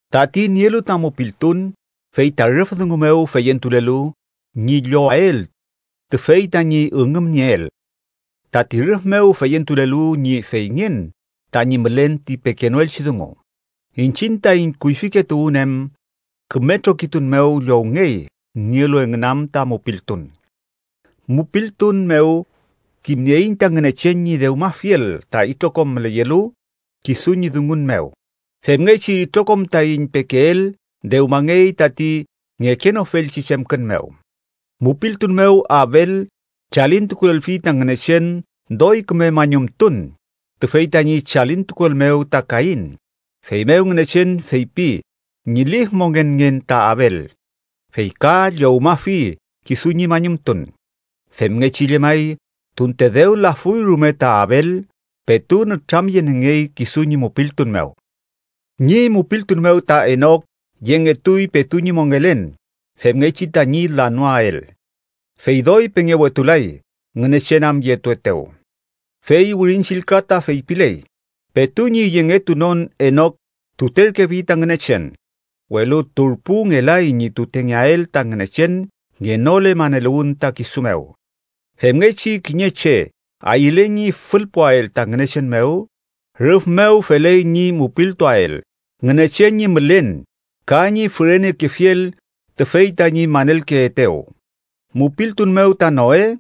Tati nielu ta mupiltun fey ta rüf dungu mew feyentulelu ñi llowael tüfey tañi üngümnieel, tati rüf mew feyentulelu ñi feyngen tañi mülen ti pekenoelchi dungu. Iñchiñ taiñ kuyfike tuwün em küme trokitun mew llowngey nielu engün am ta mupiltun. Mupiltun mew kimnieiñ ta Ngünechen ñi dewmafiel ta itrokom müleyelu kisu ñi dungun mew. Femngechi itrokom taiñ pekeel dewmangey tati ngekenofelchi chemkün mew. Mupiltun mew Abel chalintukulelfi ta Ngünechen doy küme mañumtun tüfey tañi chalintukuel mew ta Kain, feymew Ngünechen feypi ñi lif mongenngen ta Abel, fey ka llowmafi kisu ñi mañumtun. Femngechi llemay, tunte dew lafuy rume ta Abel, petu nütramyeniengey kisu ñi mupiltun mew. Ñi mupiltun mew ta Enok yengetuy petu ñi mongelen femngechi tañi lanoael. “Fey doy pengewetulay, Ngünechen am yetuetew.” Fey Wirin Chillka ta feypiley: “petu ñi yengetunon Enok tuterkefi ta Ngünechen”, welu turpu ngelay ñi tutengeael ta Ngünechen ngenole maneluwün ta kisu mew. Femngechi kiñe che ayüle ñi fülpuael ta Ngünechen mew, rüf mew feley ñi mupiltuael Ngünechen ñi mülen ka ñi fürenekefiel tüfey tañi manelkeetew. Mupiltun mew ta Noe,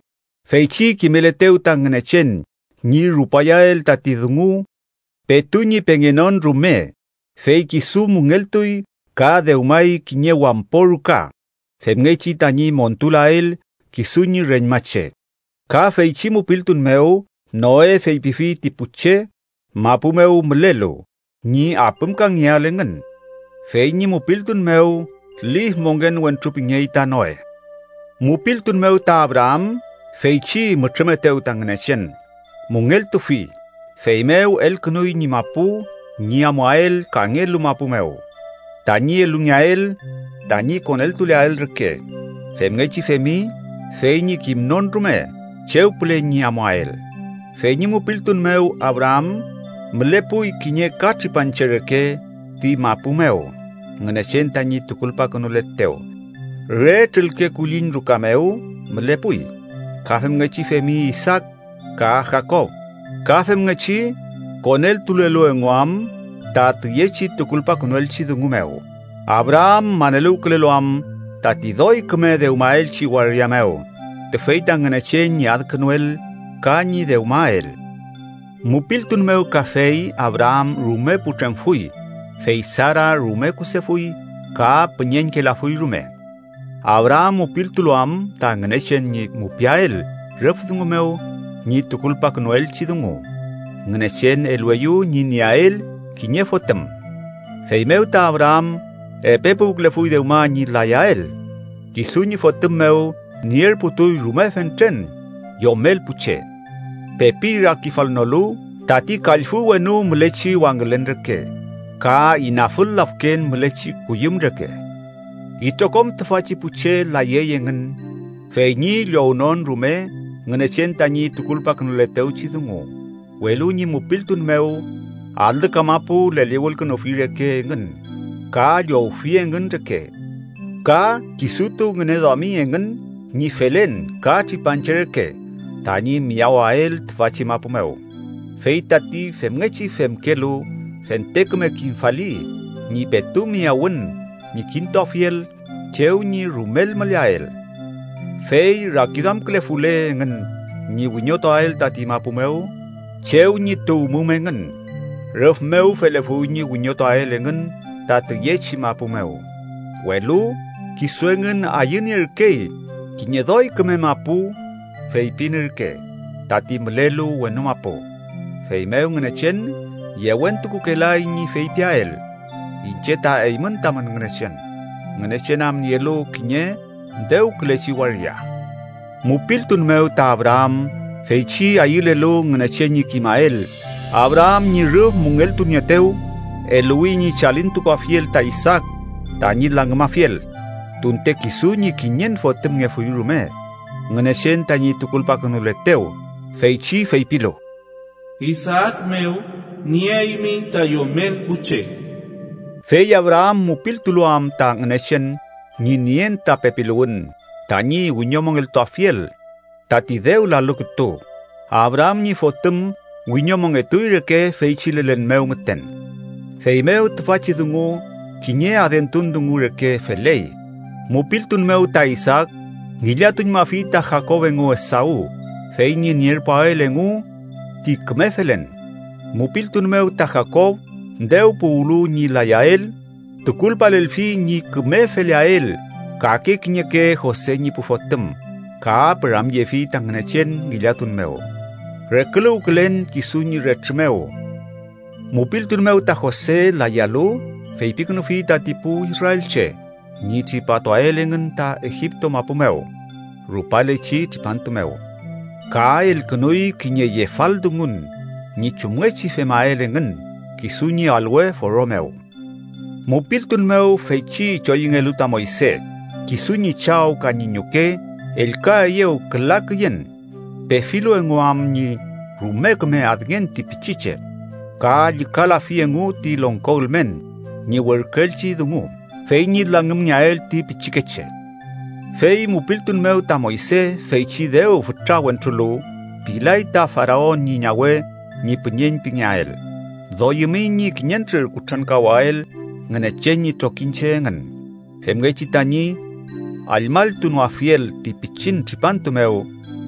feychi kimeletew ta Ngünechen ñi rupayael tati dungu petu ñi pengenon rume, fey kisu müngeltuy ka dewmay kiñe wampo ruka femngechi tañi montulael kisu ñi reñmache. Ka feychi mupiltun mew, Noe feypifi ti pu che mapu mew mülelu ñi apümkangeael engün. Fey ñi mupiltun mew, lif mongen wentru pingey ta Noe. Mupiltun mew ta Abraam, feychi mütrümetew ta Ngünechen, müngeltufi, feymew elkünuy ñi mapu ñi amuael kangelu mapu mew tañi elungeael tañi koneltuleael reke. Femngechi femi fey ñi kimnon rume chew püle ñi amuael. Fey ñi mupiltun mew Abraam mülepuy kiñe ka tripanche reke ti mapu mew Ngünechen tañi tukulpakünuletew. Re trülke kulliñ ruka mew mülepuy. Ka femngechi femi Isaak ka Jakob, ka femngechi koneltulelu engu am ta tüyechi tukulpakünuelchi dungu mew, Abraam maneluwkülelu am tati doy küme dewmaelchi waria mew, tüfey ta Ngünechen ñi adkünuel ka ñi dewmael. Mupiltun mew kafey, Abraam rume putremfuy fey Sara rume kusefuy ka püñeñkelafuy rume, Abraam mupiltulu am ta Ngünechen ñi mupiael rüf dungu mew ñi tukulpakünuelchi dungu, Ngünechen elueyew ñi nieael kiñe fotüm. Feymew ta Abraam, epe puwkülefuy dewma ñi layael, kisu ñi fotüm mew nierputuy rume fentren yomel pu che, pepi rakifalnolu tati kallfü wenu mülechi wangülen reke ka inafül lafken mülechi kuyüm reke. Itrokom tüfachi pu che layey engün fey ñi llownon rume Ngünechen tañi tukulpakünuletewchi dungu, welu ñi mupiltun mew, alü kamapu leliwülkünufi reke engün ka llowfi engün reke. Ka kisutu ngüneduami engün ñi felen ka tripanche reke tañi miyawael tüfachi mapu mew. Fey tati femngechi femkelu fente küme kimfali ñi petu miyawün ñi kintuafiel chew ñi rumel müleael. Fey rakiduamkülefule engün ñi wiñotuael tati mapu mew chew ñi tuwmum engün, rüf mew felefuy ñi wiñotuael engün ta tüyechi mapu mew, welu kisu engün ayünierkey kiñe doy küme mapu, feypin ürke: tati mülelu wenu mapu. Feymew Ngünechen yewentukukelay ñi feypiael “iñche ta eymün tamün Ngünechen”, Ngünechen am nielu kiñe dewkülechi waria. Mupiltun mew ta Abraam, feychi ayülelu Ngünechen ñi kimael Abraam ñi rüf müngeltunieetew, eluwi ñi chalintukuafiel ta Isaak tañi langümafiel tunte kisu ñi kiñen fotümngefuy rume Ngünechen tañi tukulpakünuletew, feychi feypilu: “Isaak mew nieaymi ta yomel pu che.” Fey Abraam mupiltulu am ta Ngünechen ñi nien ta pepiluwün tañi wiñomongeltuafiel tati dew lalu kütu, Abraam ñi fotüm wiñomongetuy reke feychi lelen mew müten, feymew tüfachi dungu kiñe adentun dungu reke feley. Mupiltun mew ta Isaak ngillatuñmafi ta Jakob engu Esaw fey ñi nierpuael engu ti küme felen. Mupiltun mew ta Jakob dew puwlu ñi layael, tukulpalelfi ñi küme feleael kake kiñeke Jose ñi pu fotüm ka “püramyefi ta Ngünechen ngillatun mew, reküluwkülen kisu ñi retrü mew.” Mupiltun mew ta Jose, layalu, feypikünufi tati pu israelche ñi tripatuael engün ta Egipto mapu mew rupalechi tripantu mew. Ka elkünuy kiñe yefaldungun ñi chumngechi femael engün kisu ñi alwe foro mew. Mupiltun mew, feychi choyüngelu ta Moyse, kisu ñi chaw ka ñi ñuke ellkaeyew küla küyen, pefilu engu am ñi rume küme adngen ti pichiche. Ka llükalafi engu ti longko ülmen ñi werküelchi dungu fey ñi langümngeael ti pichikeche. Fey mupiltun mew ta Moyse, feychi dew fütra wentrulu, pilay ta Faraon ñi ñawe ñi püñeñ pingeael. Doyümi ñi kiñentrür kutrankawael Ngünechen ñi trokiñche engün femngechi tañi allmalltunoafiel ti pichin tripantu mew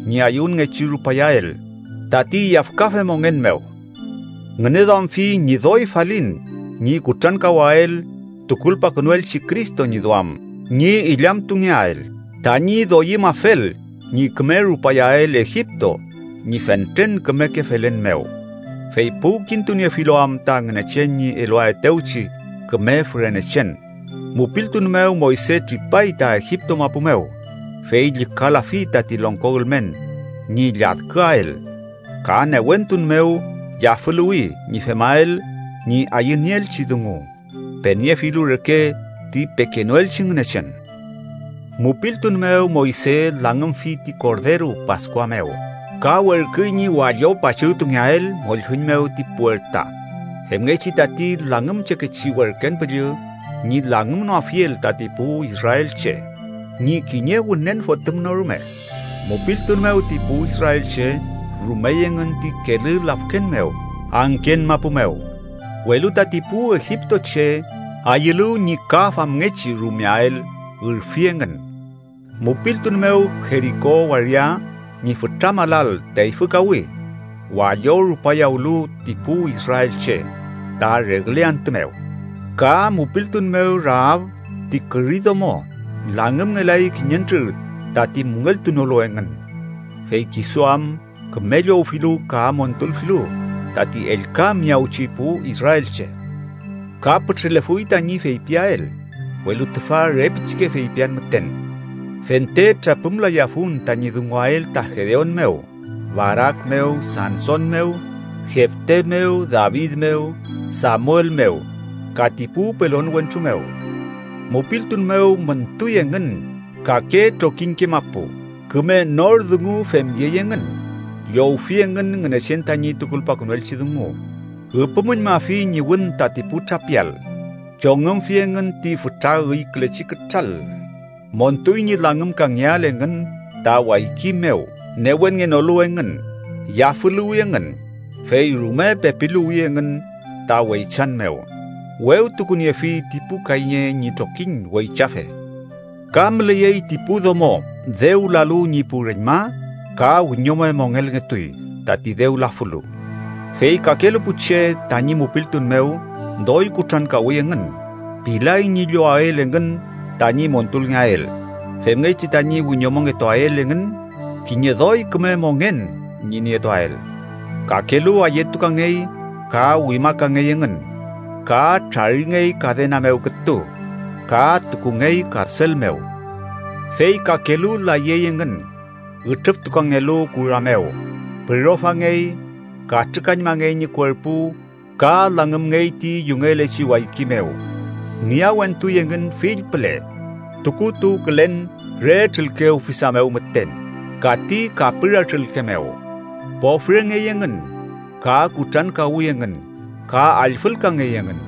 ñi ayüwünngechi rupayael tati yafkafe mongen mew. Ngüneduamfi ñi doy falin ñi kutrankawael tukulpakünuelchi Cristo ñi duam ñi illamtungeael, tañi doyümafel ñi küme rupayael Egipto ñi fentren kümeke felen mew, fey puwkintuniefulu am ta Ngünechen ñi eluaetewchi küme fürenechen. Mupiltun mew, Moyse tripay ta Egipto mapu mew, fey llükalafi tati longko ülmen ñi lladküael. Ka newentun mew yafüluwi ñi femael ñi ayünieelchi dungu peniefilu reke ti pekenoelchi Ngünechen. Mupiltun mew, Moyse langümfi ti korderu Paskua mew ka werküy ñi wallo pachügtungeael mollfüñ mew ti puerta, femngechi tati langümchekechi werken püllü ñi langümnoafiel tati pu israelche ñi kiñe wünen fotüm no rume. Mupiltun mew ti pu israelche rumey engün ti Kelü Lafken mew angken mapu mew, welu tati pu egiptoche ayülu ñi ka famngechi rumeael, ürfi engün. Mupiltun mew Jeriko waria ñi fütra malal teyfükawi, wallo rupayawlu ti pu israelche ta regle antü mew. Ka mupiltun mew, Raab ti küri domo langümngelay kiñentrür tati müngeltunolu engün, fey kisu am küme llowfilu ka montulfilu tati ellka miyawchi pu israelche. Ka pütrülefuy tañi feypiael, welu tüfa re pichike feypian müten. Fente trapümlayafun tañi dunguael ta Gedeon mew, Barak mew, Sanson mew, Jefte mew, David mew, Samuel mew, ka ti pu pelon wentru mew. Mupiltun mew müntuy engün kake trokiñke mapu, küme nor dungu femyey engün, llowfi engün Ngünechen tañi tukulpakünuelchi dungu. Üpümüñmafi ñi wün tati pu trapial, chongümfi engün ti fütra üykülechi kütral, montuy ñi langümkangeael engün ta wayki mew, newenngenolu engün, yafüluwi engün, fey rume pepiluwi engün ta weychan mew, wewtukuniefi ti pu kayñe ñi trokiñ weychafe. Ka müleyey ti pu domo dew lalu ñi pu reñma, ka wiñome mongelngetuy tati dew lafulu. Fey kakelu pu che tañi mupiltun mew doy kutrankawi engün, pilay ñi llowael engün tañi montulngeael, femngechi tañi wiñomongetuael engün kiñe doy küme mongen ñi nietuael. Kakelu ayetukangey ka wimakangey engün, ka traringey kadena mew kütu ka tukungey karsel mew. Fey kakelu layey engün ütrüftukangelu kura mew, pürofangey, katrükañmangey ñi kuerpu ka langümngey ti yungelechi wayki mew, miyawentuy engün fill püle tukutuwkülen re trülke ufisa mew müten ka ti kapüra trülke mew. Pofrengey engün ka kutrankawi engün ka allfülkangey engün.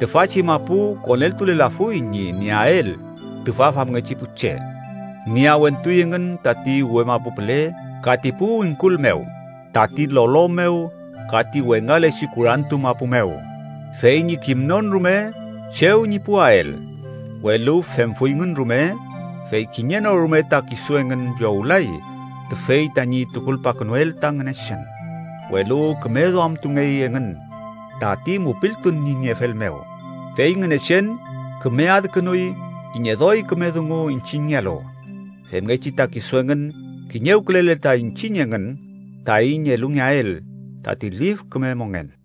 Tüfachi mapu koneltulelafuy ñi nieael tüfa famngechi pu che. Miyawentuy engün tati uwe mapu püle, ka ti pu wingkul mew, tati lolo mew ka ti wengalechi kurantu mapu mew fey ñi kimnon rume chew ñi puwael. Welu femfuyngün rume, fey kiñe no rume ta kisu engün llowlay tüfey tañi tukulpakünuel ta Ngünechen, welu küme duamtungey engün tati mupiltun ñi niefel mew. Fey Ngünechen küme adkünuy kiñe doy küme dungu iñchiñngealu, femngechi ta kisu engün kiñewkülele ta iñchiñ engün taiñ elungeael tati lif küme mongen.